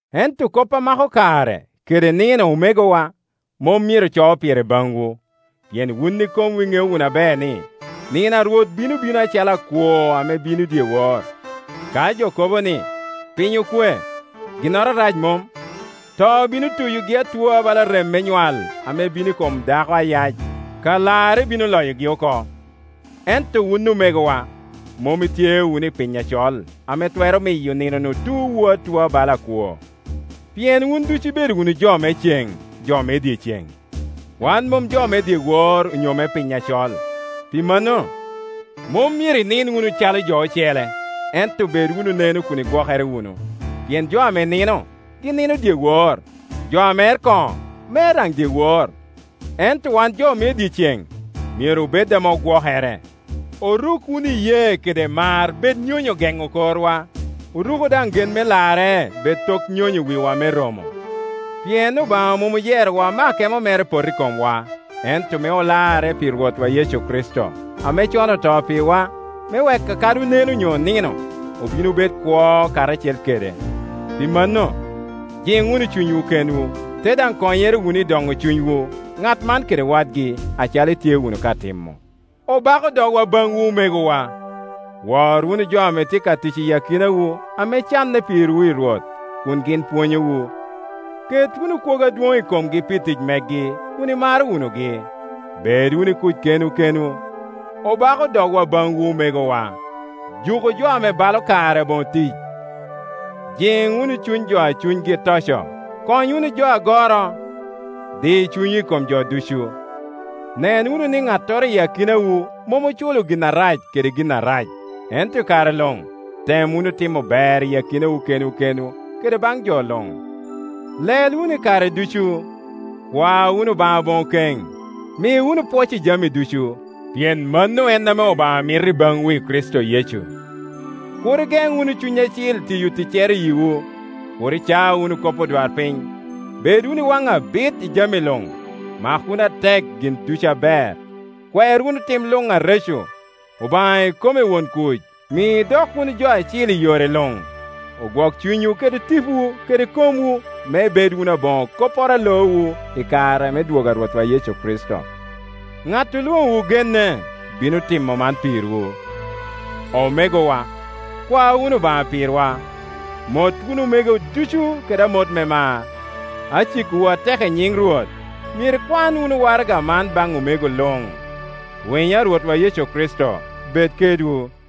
Ento kop a mako kare, kede nino, omegowa, mom myero aco pire baŋwu, Pet. 3.10pien wun ikomwu iŋeo wunu aber ni, nino a Rwot bino bino acalo akwo ame bino dyewor. Ka jo kobo ni, “Piny okwe, ginnoro arac mom,” to bino tuyogi atua bala rem me nywal ame bino i kom dako ayac, ka larre bino loyogi oko. Ento wun omegowa, mom itye wunu i piny acol, ame twero miyo nino-nu tuowu atua bala akwo. Pien wun ducu ibedo wunu jo me ceŋ, jo me dyeceŋ; wan mom jo me dyewor onyo me piny acol. Pi mano, mom myero inin wunu calo jo ocele, ento bed wunu neno kun igwokere wunu. Pien jo ame nino, gin nino dyewor, jo a mer koŋo, mer daŋ dyewor, ento wan jo me dyeceŋ, myero obed ame ogwokere. Oruk wunu iyee kede mar bed nyonyo geŋo korwa, oruku daŋ gen me larre, bed tok nyonyo wiwa me romo. Pien Obaŋa mom oyerowa me akemo mere pot i komwa, ento me olarre pi Rwotwa Yecu Kricito, ame con oto pirwa, me wek kadi oneno onyo onino, obin obed wunu kwo karacel kede. Pi mano, jiŋ wunu cunywu kenwu, ite daŋ konyere wunu i doŋo cunywu, ŋat man kede wadgi, acalo itye wunu ka timo. Obako dogwa baŋwu omegowa, wor wunu jo ame tye ka tic iyi akinawu ame canne pirwu i Rwot, kun gin pwonyowu. Ket wunu kwogo adwoŋ i komgi pi tic megi, kun imaro wunugi. Bed wunu i kuc kenwu kenwu. Obako dogwa baŋwu omegowa, juku jo ame balo kare aboŋo tic, jiŋ wunu cuny jo a cunygi toco, kony wunu jo agoro, di cunywu i kom jo ducu. Nen wunu ni ŋattoro i akinawu mom oculo gin arac kede gin arac, ento i kare luŋ tem wunu timo ber i akinawu kenwu kede baŋ jo luŋ. Lel wunu i kare ducu. Kwa wunu Obaŋa aboŋo keŋ. Mi wunu pwoc i jami ducu, pien mano en ame Obaŋa mito i baŋwu i Kricito Yecu. Kur igen wunu Cuny Acil tiyo ticcere i yiwu, kur ica wunu kop odwarpiny, bed wunu iwaŋ abit i jami luŋ; mak wunu atek gin ducu aber, kwer wunu tim luŋ areco. Obaŋa ikome won kuc mi idok wunu jo acil i yore luŋ, ogwok cunywu kede tipowu kede komwu me ibed wunu aboŋo kopporo a loowu i kare me dwogo a Rwotwa Yecu Kricito. Ŋat olwoŋowu genne; bino timo man pirwu. Omegowa, kwa wunu Obaŋa pirwa. Mot wunu omego ducu kede amot me mar. Acikowu atek i nyin Rwot, myero ikwan wunu waraga man baŋ omego luŋ. Winyo a Rwotwa Yecu Kricito bed kedwu,